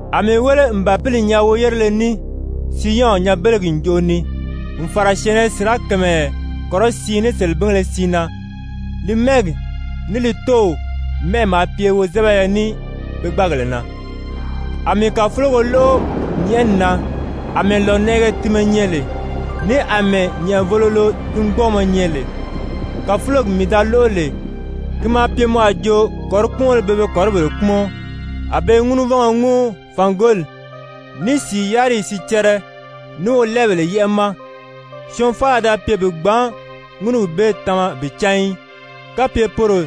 A mii wéle n Bàpili nyaa woyérele ní Siyɔn nyanbelegi ǹjoʔo ni n fàra syɛ̀ɛnnɛ sirakamayɛ kɔrɔsiin ní selebingéle siin na, li mɛ́ɛgi ní li Tóow mɛ́ʔɛ maa pye wozɛbɛyɛ ní pe gbáagèle na. A mii kàfulogo lóʔo nyɛ̀ʔɛni na àmɛɛ lònɛʔɛgɛ tinmɛ nyɛ lè, ní àmɛɛ nyɛ̀ʔɛvōlolo tingbɔɔmɔ nyɛ lè. Kàfulogi mii da lóʔo lè, ki maa pye mɔ a jo kɔ̀ríkpumɔnbéle pe be kɔ̀ríbèle kpúmɔn. A be i ŋúnuvɔngɔ ŋúu fàngoli, ní sìi yáriyi sicɛrɛ, ní wolɛɛbèle yɛ́ʔɛ ma. Syɔɔn faala da pye bi gbǎn ŋúnugi bee tama bi cán í, kapye poro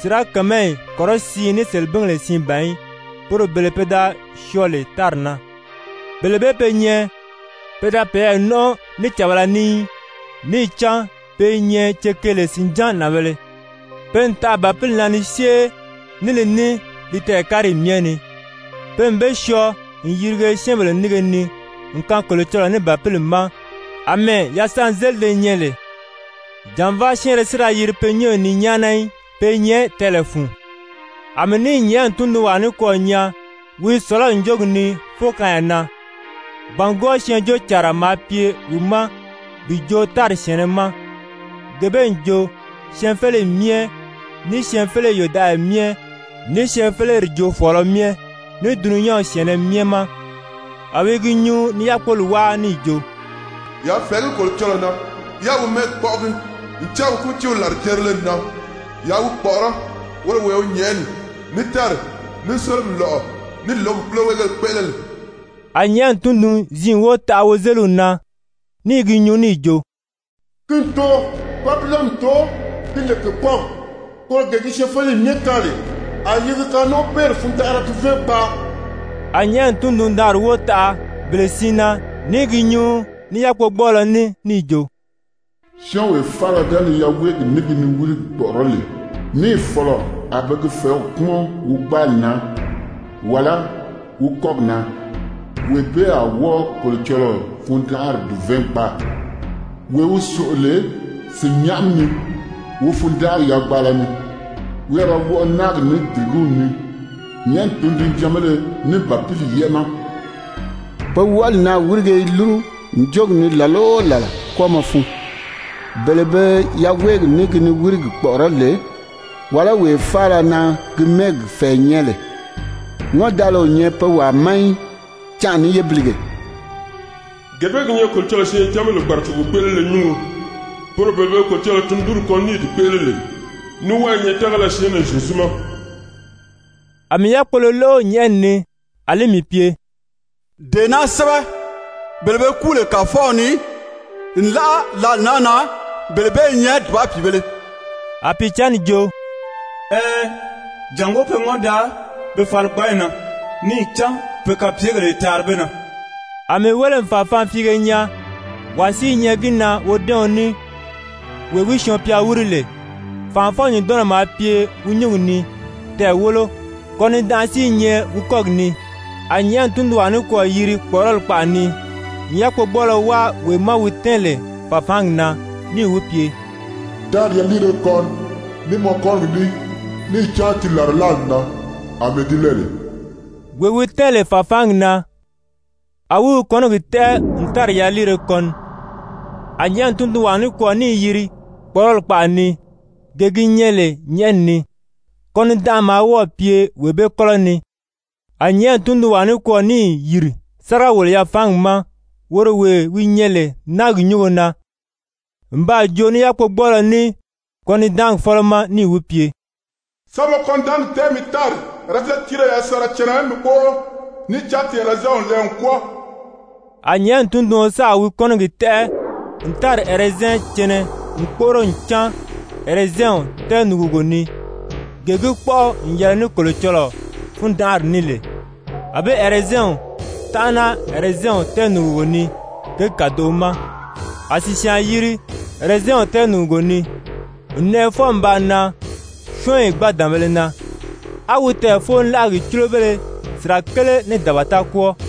sirakamayi kɔrɔsiin ní selebingèle siin ban í, poro bele pe da syɔɔ lè tári na. Bele bee be nyɛ pe da peyɛɛ nɔ́nʔɔ ní càbala ní í, níì cán pe i nyɛ cekeele sìnján nànbēle, pe n taʔa Bàpili na ni syée ní li ní li tɛɛ̀káriyi myɛ ni. Pe n be syɔɔ n yirige syɛ́ɛnbèle nínge ni n kaan Kolocɔlɔɔ ní Bàpili ma àmɛɛ yasanzelide nyɛ lè, jànvaa syɛ́ɛnrɛ si da yiri pe nyɔ́ɔyi ni nyáana í. Pe i nyɛ tɛɛlɛ fun. A mii níì nyɛ̀ʔɛni tundunwaa nikwɔɔ nyaa wi i sɔ̀lɔ́ ǹjogi ni fókaanya na. Bàngwɔɔ Syɛɛnjóocànra maa pye wi ma bi joo tári syɛ̀ɛnnɛ ma, gee bee n jo, syɛɛnfeleyi myɛ, ní syɛɛnfeleyi yòdaʔaya myɛ, ní syɛɛnfeleri joofɔɔlɔ myɛ, ní dulunyanw syɛ̀ɛnnɛ myɛ ma. A wi i gi nyuu ni yákpoli wáa níì jo: «Yaa fɛ̀ɛgí Kolocɔlɔɔ na, yáā wi mɛ́ɛgi kpɔ́ʔɔgi, ncan wi kútiiw làrijerile n nan. Yaa wi kpɔ̀ʔɔrɔ́ woro wee wi nyɛ̀ʔɛni, ní tári, ní sólomi lɔ̀ʔɔ, ní lǒgi púloweegéle kpéʔele lè.» A nyɛ̀ʔɛni tundun-ziin wóo taʔa wozeliw na ní i gi nyuu níì jo: «Ki n too, Babilɔni n too, ki lè kèkpɔɔgi, koro gee gi syɛɛnfeleyi myɛ kaan lè a yi gi kanɔnʔɔbeeri fundanʔara duvɛɛn gbaa.» A nyɛ̀ʔɛni tundun-daanri wóo taʔa bele siin na ní i gi nyuu ní yákpogbɔɔlɔ ní níì jo: «Syɔ́ɔnwee faala ga ni yaweegi ní gi niwirigi kpɔ̀ʔɔrɔ́ lè, níì fɔ̀lɔ a be gi fɛ̀ɛ́w kpúmɔn wi gbáali na, wàlá wi kɔ́gi na, wee bee a wɔ́ɔ Kolocɔlɔɔ fundanʔari dùvɛɛn gbaa, wee wi sòʔo lè sìnnyaʔami ni wi fundanʔari yagbaala ni, wi a ra wɔʔɔ náagi ní dìrigíw ni, nyɛ̀ʔɛni tundunjanbéle ní Bàpili yɛ́ʔɛ ma. Pe wɔʔɔli naà wírige i lúru ǹjogi ni làla o làla kwɔ́ɔmɔ fun, bele be yaweegi ní gi niwirigi kpɔ̀ʔɔrɔ́ lè, wàlá wee faala na gi mɛ́ɛgi fɛ̀ɛ nyɛ lè, ŋɔ́ndaala o nyɛ pe wàa ma í, canʔa ní yébilige.» Gee bee gi nyɛ Kolocɔlɔɔ syɛɛncanbèle kpàracogo kpéʔelele nyúngo, poro bele be Kolocɔlɔɔ tundunri kɔn ní i di kpéʔele lè, ní wɔ́ɔ i nyɛ tágala syɛɛnnɛ Zyezu ma. A mii yákpolo lóʔo nyɛ̀ʔɛni ni, a li mii pye: «Dee naa sɛ́bɛ: Bele be kúu lè Kàfɔw ni, nlaʔa lǎli naa na, bele bee i nyɛ dùba pìibēle!» A Pìicǎnni jo: «Ɛɛn, jàngó pe ŋɔ́n daa pe faligbanyi na, níì cán pe kapyegèle i taari be na.» A mii wéle n fàfaanfiige nyaa, wàa si i nyɛ gi na wodɛ́ɛɔn ní wee wi syɔɔn-pya wíri lè. Fànʔafɔ-nyùndɔnnɔ maa pye wi nyúngi ni, tɛɛ̀ wólo, kɔnidanʔa si i nyɛ wi kɔ́gi ni. A nyɛ̀ʔɛni tundunwaa nikwɔɔ yiri kpɔ̀ʔɔrɔli kpaʔa ni n yákpogbɔɔlɔ wáa wee ma wi tɛ́ɛn lè fàfaangi na, níì wi pye: «Tári yaliire kɔni ní mɔ kɔ́nigi ní, níì cán ti làrilaali n nan àmɛɛ di lɛɛ lè.» Wee wi tɛ́ɛn lè fàfaangi na, a wi wi kɔ́nigi tɛ́ʔɛ n tári yaliire kɔni. A nyɛ̀ʔɛni tundunwaa nikwɔɔ níì yiri kpɔ̀ʔɔrɔli kpaʔa ni, gee gi nyɛ lè nyɛ̀ʔɛni ni. Kɔnidanʔa maa wɔ́ɔ̀ pye wee bee kɔ́lɔ ni. A nyɛ̀ʔɛni tundunwaa nikwɔɔ níì yìri sáriga-wòlo-yafaangi ma, woro wee wi nyɛ lè náagi nyúngo na, n baa joo ní yákpogbɔɔlɔ ní kɔnidaangi fɔ́lɔ ma níì wi pye: «Sa mɔ kɔnidaangi tɛ́ʔɛ mi tári ɛrɛzɛn tírire yasanra cɛnɛ mi kpóʔoro, níì cán ti ɛrɛzɛnw n lɛɛ n kwɔ́ɔ.» A nyɛ̀ʔɛni tunduɔn sáà wi kɔ́nigi tɛ́ʔɛ n tári ɛrɛzɛn cɛnɛ n kpóʔoro n cáan ɛrɛzɛnw tɛɛnùgugo ni, gee gi kpɔ́ʔɔ n yɛlɛ ní Kolocɔlɔɔ fundanʔari ní lè. A be ɛrɛzɛnw tánʔana ɛrɛzɛnw tɛɛnùgugo ni kěgi kàdoʔo ma. A sìsyaan yiri ɛrɛzɛnw tɛɛnùgugo ni, n nɛʔɛ fwɔɔ n baa nan syɔ́ɔnyi gbǎdanbēle na, á wi tɛɛ̀foolaʔagi cúlobéle sirakele ní dabata kwɔ́ɔ.